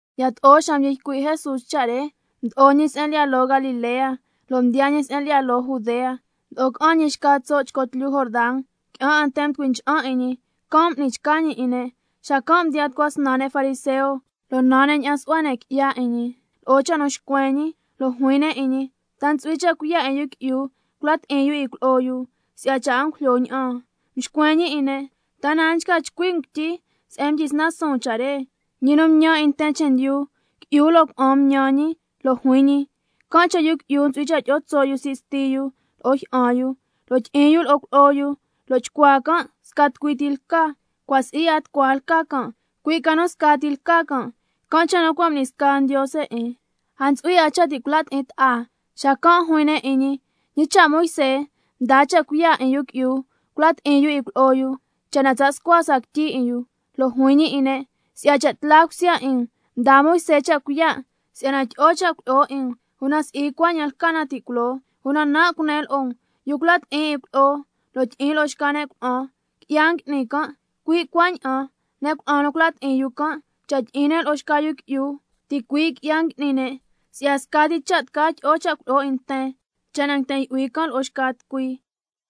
Yato'o xa mdyi ycui' Jesús cha' re, mdo'o ñi se'en lyi'ya loo Galilea, lo' mdiyaa ñi se'en lyi'ya loo Judea, mdo'o ca'an ñi xca tso' chco tlyu Jordan. Qui'an 'a nten mducui ncha'an 'in ñi, can' m'ni chca ñi 'in ne'. Xacan' mdiyaan tucua snan ne' fariseo, lo' nan ne' ña'an su'hua ne' qui'ya 'in ñi lo'o cha' nu xcuen ñi, lo' juin ne' 'in ñi: ¿Ta ntsu'hui cha' cuiya' 'in yu qui'yu cula' ti'in yu 'in cuilyi'o yu, si'ya cha' a ngujlyo ña'an? Mxcuen ñi 'in ne': ¿Ta na a nchca chcui' um quityi se'en mdyisnan suun cha' re? Ñi nu mtñan 'in nten chendyu, —qui'yu lo' cuna'an mtñan ñi—, lo' juin ñi: —Can' cha' yu qui'yu ntsu'hui cha' tyi'o tso' yu sii' sti yu lo'o jyi'an yu, lo' tyi'in yu lo'o cuilyi'o yu, lo' chcuaa can' sca tucui ti lca—. Cua' si'i 'a tucua lca can', cui' ca nu scati lca can', can' cha' nu cua' m'ni sca Ndiose 'in, a ntsu'hui 'a cha' ti' cula' ti'in ta'a. Xacan' juin ne' 'in ñi: ¿Ñi cha' Moisé mdaa cha' cuiya' 'in yu qui'yu cula' ti'in yu cuilyi'o yu, cha' na tsa' scua sca quityi 'in yu? Lo' juin ñi 'in ne': Si'ya cha' tla cusya 'in um, mdaa Moisé cha' cuiya' si'yana tyi'o cha' cuilyi'o 'in um, una si'i cuaña'an lca na ti' culoo. Una nan' cunen lo'o um, yu cula' ti'in 'in cuilyi'o lo' tyi'in lo'o xca ne' cuna'an, qui'ya ngui'ni can', cui' cuaña'an ne' cuna'an nu ngula' ti'in yu can', cha' tyi'in ne' lo'o xca yu qui'yu, ticui' qui'ya ngui'ni ne'. Si'ya scati cha' tca tyi'o cha' cuilyi'o 'in nten, cha' na yten yu'hui can' lo'o xca tucui.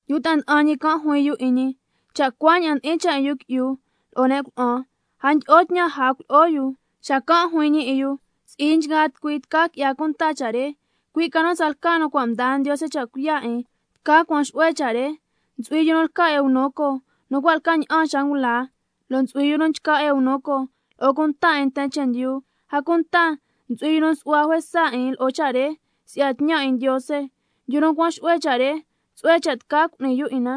Yu ta'a nda'an ñi can' juin yu 'in ñi: Cha' cuaña'an ndi'in cha' 'in yu qui'yu lo'o ne' cuna'an, a ndyi'o tñan ja cuilyi'o yu. Xacan' juin ñi 'in yu: Si'i nchgaa tucui tca qui'ya cunta cha' re, cui' ca nu tsalca nu cua' mdaa Ndiose cha' cuiya' 'in tca cuan xu'hue cha' re. Ntsu'hui yu nu lca eunuco nu cua' lca ña'an xa ngula, lo' ntsu'hui yu nu nchca eunuco lo'o cunta 'in nten chendyu, a cunta ntsu'hui yu nu nsu'hua juesa 'in lo'o cha' re si'ya tñan 'in Ndiose. Yu nu cuan xu'hue cha' re, tsu'hue cha' tca cu'ni yu 'in na.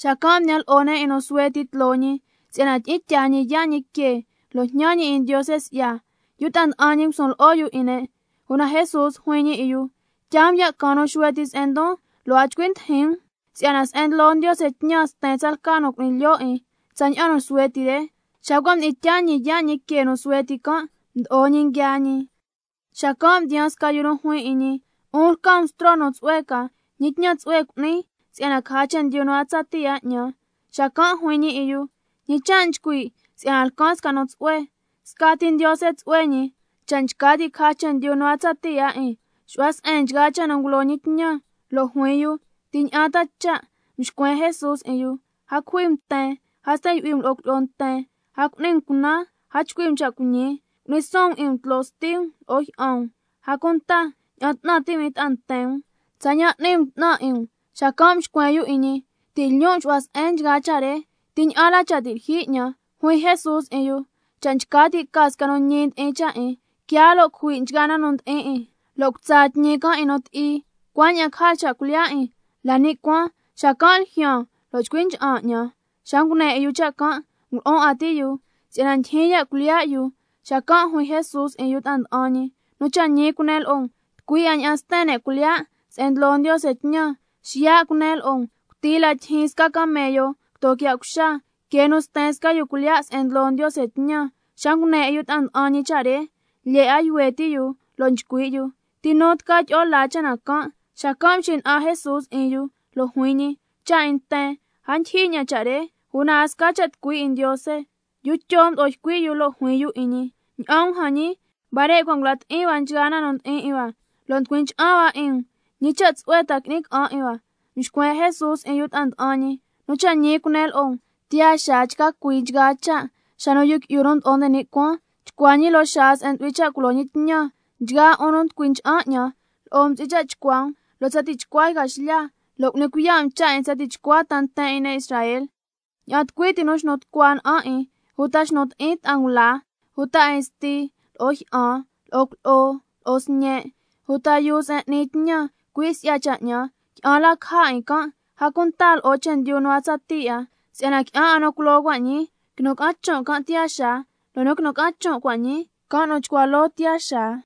Xacan' mdiyan lo'o ne' 'in nu suhue ti tloo ñi, si'yana tyi'in tyaa ñi yaa' ñi que, lo' jñan ñi 'in Ndiose si'ya. Lo' yu ta'a nda'an ñi ngusun lo'o yu 'in ne'. Una Jesús juin ñi 'in yu: Tyaa um ya' caan nu suhue ti se'en ndon, lo' a chcui ndijin um, si'yana se'en ndlo Ndiose tñan sten tsalca nu cu'ni lyo' 'in tsaña'an nu suhue ti re. Xa cua' mdi'in tyaa ñi yaa' ñi que nu suhue ti can', mdo'o ñi nguiaa ñi. Xacan' mdiyaan sca yu juin 'in ñi: 'Un lca um bstro nu tsu'hue ca, ¿ñi tñan tsu'hue cu'nin si'yana caja chendyu nu a tsatii 'a 'ñan? Xacan' juin ñi 'in yu: ¿Ñi cha' nchcui' si'yana lcan sca nu tsu'hue? Scati Ndiose tsu'hue ñi. Cha' nchca ti' caja chendyu nu a tsatii 'a 'in, xu'hua se'en cha' nu ngulo ñi tñan. Lo' juin yu: ¿Ti ña'an ta cha'? Mxcuen Jesús 'in yu: —A cujui um nten, a sten yu'hui um lo'o cuilyi'o nten, a cu'ni um cunan, a chcui' um cha' cuiñi. Cu'ni suun um 'in um tloo sti um lo'o jyi'an um—, a cunta —ña'an 'tnan ti' um 'in ta'a nten um tsaña'an n'ni um 'tnan 'in um—. Xacan' mxcuen yu 'in ñi: Ti' lyon' nxu'hua se'en nchgaa cha' re. ¿Ti ña'an la cha' ti' lyijyi 'ñan? Juin Jesús 'in yu: Cha' nchca ti' ca sca nu ñi ndi'in cha' 'in, quiaa lo' cujui' nchgaa na nu ndi'in 'in, lo' cutsa tñi can' 'in nu ti'i, cuaña'an caja cha' cuilyiya' 'in la ni' cuaan, xacan' ljyaan lo' chcui ncha'an 'ñan. Xa ngune 'in yu cha' can', ngulu'un 'a ti' yu si'yana ndyijyin ya' cuilyiya' yu. Xacan' juin Jesús 'in yu ta'a nda'an ñi: Nu cha' ñi cunen lo'o um, tucui 'a ña'an sten ne' cuilyiya' se'en ndlo Ndiose tñan. Xiya' cunen lo'o um: Cuti la tyijyin sca camello quito quiya' cuxa, que nu sten sca yu cuilyiya' se'en ndlo Ndiose tñan. Xa ngune 'in yu ta'a nda'an ñi cha' re, lyee 'a yuhue ti' yu lo' nchcui' yu: ¿Ti nu ta tca tyi'o laa cha' na can'? Xacan' mxina'an Jesús 'in yu, lo' juin ñi: Cha' 'in nten, a ndyijyi ña'an cha' re, una a sca cha' tucui 'in Ndiose. Yu Tyo mdo'o ycui' yu lo' juin yu 'in ñi: Ña'an um jan ñi, huare' cua' ngula' ti'in hua nchgaa na nu ndi'in 'in hua, lo' nducui ncha'an hua 'in um, ¿ñi cha' tsu'hue ta qui'ni ca'an 'in hua? Mxcuen Jesús 'in yu ta'a nda'an ñi: Nu cha' ñi cunen lo'o um, tiyaa xaa chca cui nchgaa cha', xa nu Yu Qui'yu nu Mdo'o nde ni' Cuaan chcua ñi loo xaa se'en ntsu'hui cha' culo ñi tñan, nchgaa 'un nu nducui ncha'an 'ñan, lo'o um ntsu'hui cha' chcua um loo tsa tichcua yca xlya, lo' cu'ni cuiya' um cha' 'in tsa tichcua ta nten 'in ne' Israel. Ña'an tucui ti nu xnu tucua na'an 'in, uta xnu ti'in ta'a ngula, uta 'in sti lo'o jyi'an, lo'o cuilyi'o, lo'o sñe', uta yuu se'en n'ni tñan, cui' si'ya cha' 'ñan, qui'an la caja 'in can', a cunta lo'o chendyu nu a tsatii 'a. Si'yana qui'an 'a nu culoo cua' ñii, quinu ca'an chon' can' tiyaa xaa. Lo' nu nguinu ca'an chon' cua' ñii, can' nu chcua loo tiyaa xaa.